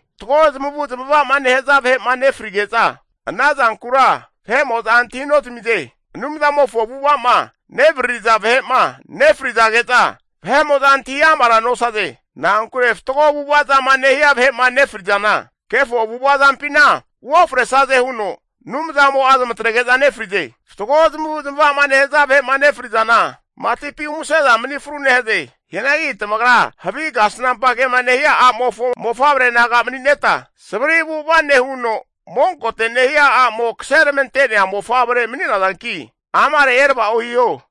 Fatgo zamavu'zmavama nehaza vahe'ma nefrige'za, ana zankura vahe'mo'za antahinozamize. Anumzamofo avu'ava'ma nevaririza vahe'ma nefrizage'za, vahe'mo'za antahi amara nosaze. Na'ankure fatgo avu'ava zama nehia vahe'ma nefrizana kefo avu'ava zampina oufresaze huno Anumzamo'a zamatrege'za nefrize. Fatgo zamavu zamava'ma nehaza vahe'ma nefrizana, matipi umase'za mani fru nehaze. Hianagi tamagra havi kasnampa kema nehia a'mofo mofavre naga mani'neta, savri avu'ava nehuno monkote nehia a'mo kaseramante'nea mofavre mani'nazanki amare eravao hiho.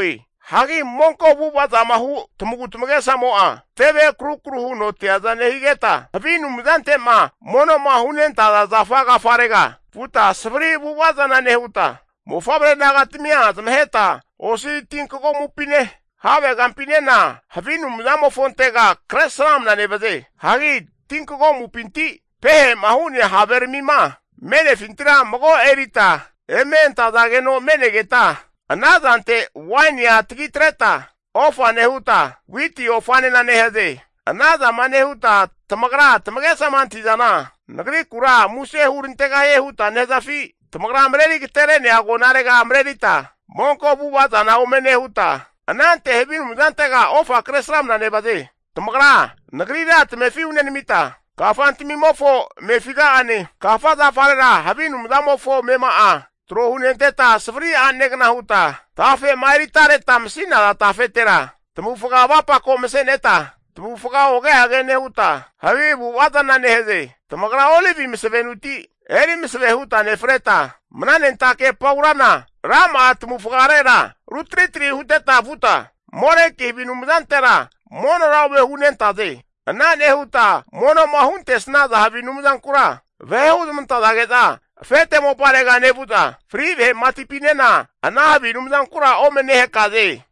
Hagi monko avu'avazama hu tamagu tamagesamo'a teve akrukru huno teaza nehigeta, havi anumzante'ma mono'ma hunentaza zafa agafarega vuta savari avu'ava zana nehuta, mofavre nagatamia zamaheta osi tinkagomupine, havegampinena havi anumzamofontega kresramna nevaze. Hagi tinkagomupinti pehema hu'nea haveramima me'nefintira mago erita eme antazageno me'negeta, ana zante wainia tagitreta ofa nehuta, witi ofanena nehaze. Ana zama nehuta tamagra tamagesama antahi'zana Nagrikura muse hurantegahie huta nehazafi? Tamagra mareri agatere'nea agonarega marerita monko avu'ava zana ome nehuta, anante havi anumzantega ofa kresramna nevaze. Tamagra tamefi Nagrira hunenamita, kafantamimofo amefiga'ane, kafa zafarera havi anumzamofo amema'a tro hunenteta, savri anegna huta tafe'ma eritareta masi'naza tafetera tamavufga avapako mase'neta tamavufga oge age nehuta, havi avu'vazana nehaze. Tamagra olivi masavenuti eri maseve huta nefreta, mnanentake paurana rama'a tamavufgarera rutritri huteta vuta, Moleki havi anumzantera monora ome hunentaze. Ana nehuta mono'ma huntesnaza havi anumzankura vahe huzmantazage'za afete moparega nevu'za, fri vahe matipinena ana havi anumzankura ome nehakaze.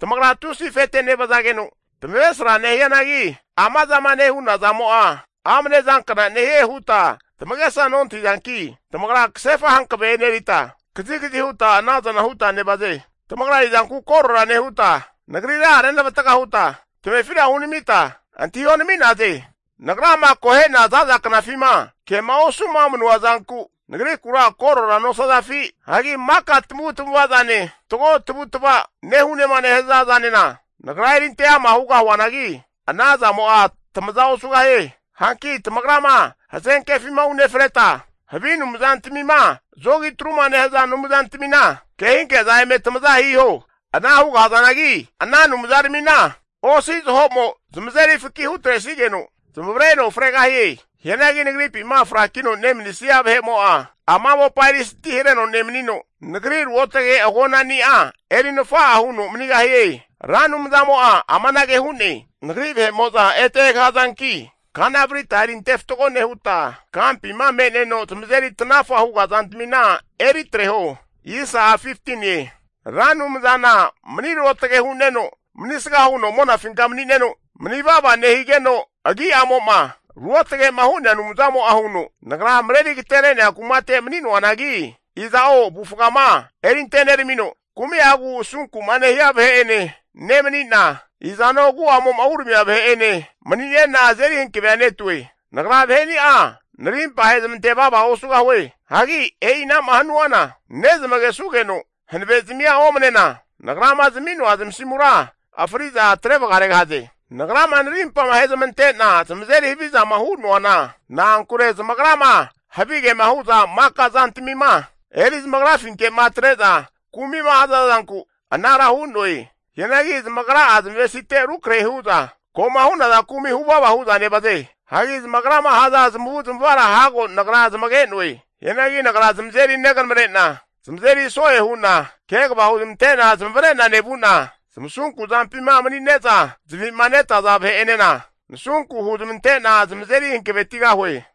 Tamagra tusi afete nevazageno tamavesra nehianagi, amazama nehuna zamo'a amne zankna nehie huta tamagesa nontahizanki tamagra kasefa hankave enerita, kazikazi huta anazana huta nevaze. Tamagra izanku korora nehuta, Nagrira renavatga huta tamefira hunamita antahionami'naze? Nagrama akohe'na zaza knafima kema osuma manua zanku Nagrikura korora nosazafi? Hagi maka tamavu tamava'zane, fatgo tavutava nehunema nehaza zanena, Nagra erinte ama hugahuanagi, ana zamo'a tamaza osugahie. Hanki tamagrama hazenkefima unefreta, havi anumzantamima zogi atruma nehaza anumzantamina kehinke'za eme tamaza hiho. Ana hugahazanagi ana anumzaramina osi zaho'mo zamazeri faki hutresigeno zamavareno fregahie. Hianagi Nagripima frakino nemanisnia vahe'mo'a ama mopa erisanti hareno nemanino, Nagri ruotage agonani'a eri nafa'a huno manigahie. Ra Anumzamo'a amanage hu'ne, Nagri vahe'mo'za ete egahazanki, kana varita eri ante fatgo nehuta, kampima me'neno zamazeri tanafa huga zantamina eritreho. Ra Anumzana mani ruotage hu'neno manisga huno monafinka mani'neno manivava nehigeno agi'amo'ma ruotgema hu'nea Anumzamo'a huno, Nagra mareri agetere'nea kumate mani'noanagi, iza'o avufgama erinte neramino, kumi'agu asunku'ma nehia vahe'ene nemanina, izano agu'amo'ma uramia vahe'ene mani'nena azeri hankavea netue. Nagra vaheni'a narimpa ahezmante vava osugahue. Hagi e'inama hanuana nezmagesugeno hanavezmia omnena, Nagrama zami'noa zamasimura fri'za atre vagaregahaze. Nagrama narimpama ahezmante'na zamazeri havizama hunoana, na'ankure zamagrama havigema hu'za maka zantamima eri zamagrafinke'ma atre'za kumi'ma haza zanku anara hu'noe. Hianagi zamagra'a zamavesite rukrahe hu'za ko'ma hu'naza kumi huvava hu'za nevaze. Hagi zamagrama haza zamavu'zamavara hago Nagra zamage'noe. Hianagi Nagra zamazeri neganamrena zamazeri so'e hu'na kegava huzmante'na zamavare'na nevu'na, zamasunku zampima mani'neza zavi'ma netaza vahe'enena nasunku huzmante'na zamazeri hankavetigahue.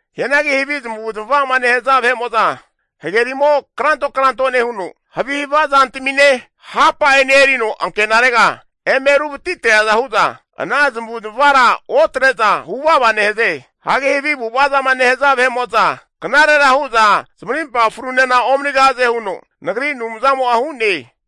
Hianagi havi zamavu zamava'ma nehaza vahe'mo'za, hagerimo kranto kranto nehuno, havi hava zantamine hapa'ene erino ankenarega eme ruvati treaza hu'za ana zamavu zamavara otre'za huvava nehaze. Hagi havi avu'avazama nehaza vahe'mo'za knarera hu'za zamarimpa frunena omanigahaze huno Nagri Anumzamo'a hu'ne.